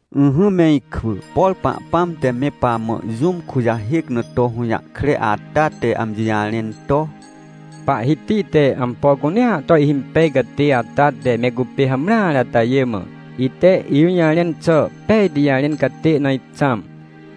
Ỹhỹ me ikwỳ, por Pahpãm te me pamã jũm kujahêc na to hũjahkre ata te amji jarẽn to: “Pahhiti te ampo cunea to ihhimpej catê ata te me cupê hamreare atajê mã, ite ijũjarẽn xà pejti jarẽn catê na ixãm,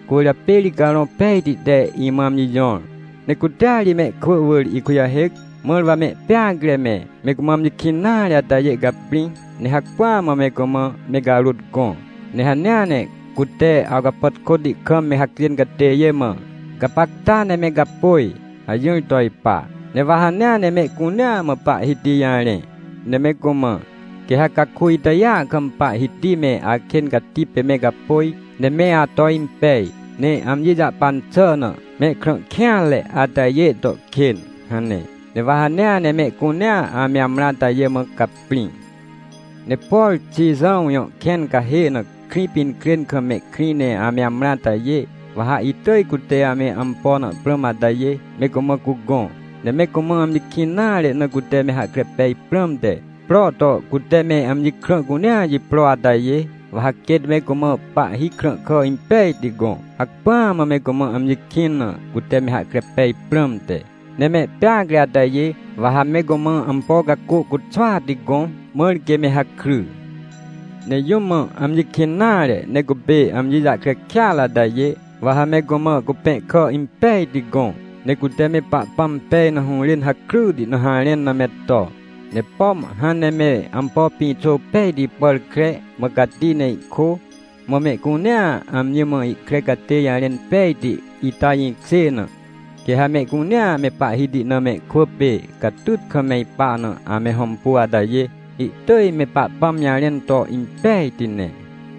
cwỳrjapê ri Carõ Pejti te imã amji jõr. Ne cutea ri mehkwỳ wỳr ikujahêc, mãr wa mehpeacre me, me cumã amji kĩn nare atajê caprĩ, ne hacpỹa mã me cumã me carôt gõ. Ne hanea ne cute awcapàtkôti kam me hacjên catêjê mã: ‘Gapacta ne me gapôj’ hajỹr to ipa. Ne wa hanea ne mehcunea mã Pahhiti jarẽ, ne me cumã: ‘Quê ha caku itajêa kam Pahhiti me akên cati pê me gapôj ne me ato impej, ne amji jahpan xà na, mehkrã kêanre atajê to kên’ hane. Ne wa hanea ne mehcunea ame amrã atajê mã caprĩ. “Ne por Xijãw jõ kẽn cahê na Krĩpinkrên kam mehkrĩ ne ame amrã atajê, wa ha itỳj cute ame ampo na prãm atajê, me cumã cugõ. Ne me cumã amji kĩn nare na cute me hahkre pej prãmte, pro to cute me amji krã cunea jipro atajê, wa ha quêt me cumã pahhi krãhkà impejti gõ, hacpỹa mã me cumã amji kĩn na, cute me hahkre pej prãmte. Ne mehpeacre atajê, wa ha me cumã ampo cacô cuxwati gõ, mãr quê me hakry. Ne jũm mã amji kĩn nare ne cupê amji jahkre kêatre atajê, wa ha me cumã cupẽhkà impejti gõ, ne cute me Pahpãm pej na hũrên hakryti na harẽn na me to. Ne pom hãn ne me ampo pĩxô pejti pàr kre, mã cati ne ihkô, mã mehcunea amji mã ihkre catê jarẽn pejti, ita jĩkjê na, quê ha mehcunea me Pahhiti na mehkwỳ pê catyt kam me ipa na ame hõmpu atajê, ihtỳj me Pahpãm jarẽn to impejti ne.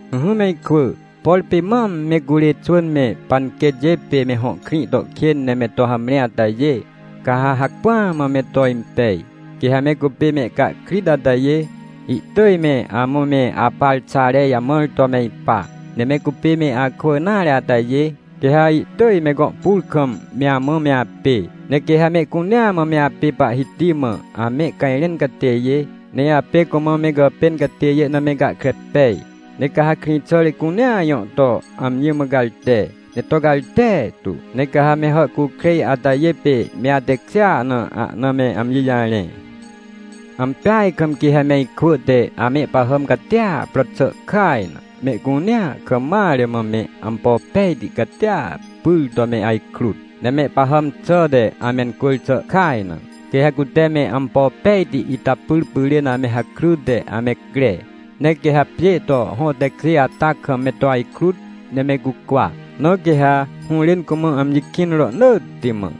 “Ỹhỹ me ikwỳ, por pê mam me curê xwỳn me panquêtjê pê me hõ krĩ to kên ne me to hamre atajê, ca ha hacpỹa mã me to impej. Quê ha me cupê mehcahkrit atajê, ihtỳj me amã me aparxare jamãr to me ipa. Ne me cupê me akwỳ nare atajê, quê ha ihtỳj me gõ pur kam me amã me apê. Ne quê ha mehcunea mã me apê Pahhiti mã amehcajrẽn catêjê, ne apê cumã me gàpên catêjê na me gahkre pej. Ne ca ha krĩxàre cunea jõ to amji mã garte, ne to garte tu. Ne ca ha me hàhcukrêj atajê pê me atekjêa na ahna me amji jarẽ. “Ampeaj kam quê ha me ikwỳ te amehpahàm catia pro xà kaj na, mehcunea kam mare mã me ampo pejti catia pyr to me ajkrut. Ne mehpahàm xàhte amencwỳr xà kaj na, quê ha cute me ampo pejti ita pyr pyrên ame hakryte ame cre. Ne quê ha pjê to hõ tekjê ata kam me to ajkrut ne me cukwa. Na quê ha hũrên cumã amji kĩn rohnỳtti mã.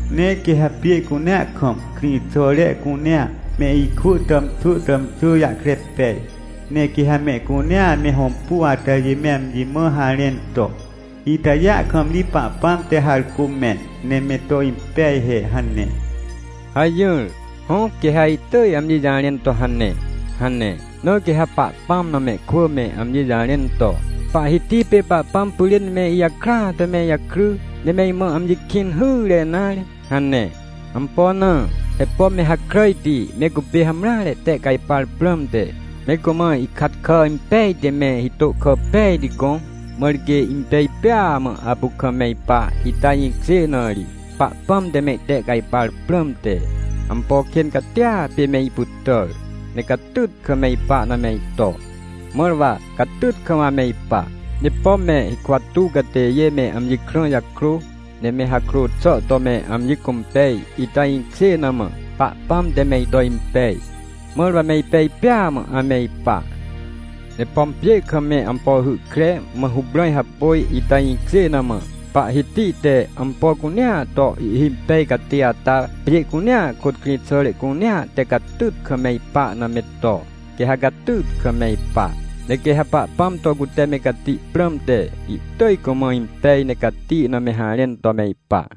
Ne quê ha pjê cunea kam, krĩxàre cunea, me ikwỳ tàmxwỳ tàmxwỳ jahkre pej. Ne quê ha mehcunea ame hõmpu atajê me amji mã harẽn to: “Itajêa kam ri Pahpãm te harcô mẽn, ne me to impej he” hane’ hajỹr. Hõ quê ha ihtỳj amji jarẽn to hane” hane. Na quê ha Pahpãm na mehkwỳ me amji jarẽn to: “Pahhiti pê Pahpãm pyrên me ijakrya to me ijakry, ne me imã amji kĩn hyre nare” hane. Ampo na? He pom me hakràjti me cupê hamreare tehcajpar prãmte, me cumã ihkat kà impejti me, hitô kà pejti gõ, mãr quê impej pêa mã apu kam me ipa, ita jĩkjê na ri, Pahpãm te me itehcajpar prãmte, ampo kên catia pê me ipytàr, ne catyt kam me ipa na me ito, mãr wa catyt kam ame ipa. Ne pom me hikwa tuw catêjê me amji krã jakrô, ne me hakrô xà to me amji cũmpej, ita jĩkjê na mã, Pahpãm te me ito impej, mãr wa me ipej pêa mã ame ipa. Ne pom pjê kam me ampo hy kre, mã huprãj hapôj, ita jĩkjê na mã, Pahhiti te ampo cunea to ihhimpej catê ata, pjê cunea kôt krĩxàre cunea te catyt kam me ipa na me to, quê ha catyt kam me ipa. Ne quê ha Pahpãm to cute me cati prãmte, ihtỳj cumã impej ne cati na me harẽn to me ipa.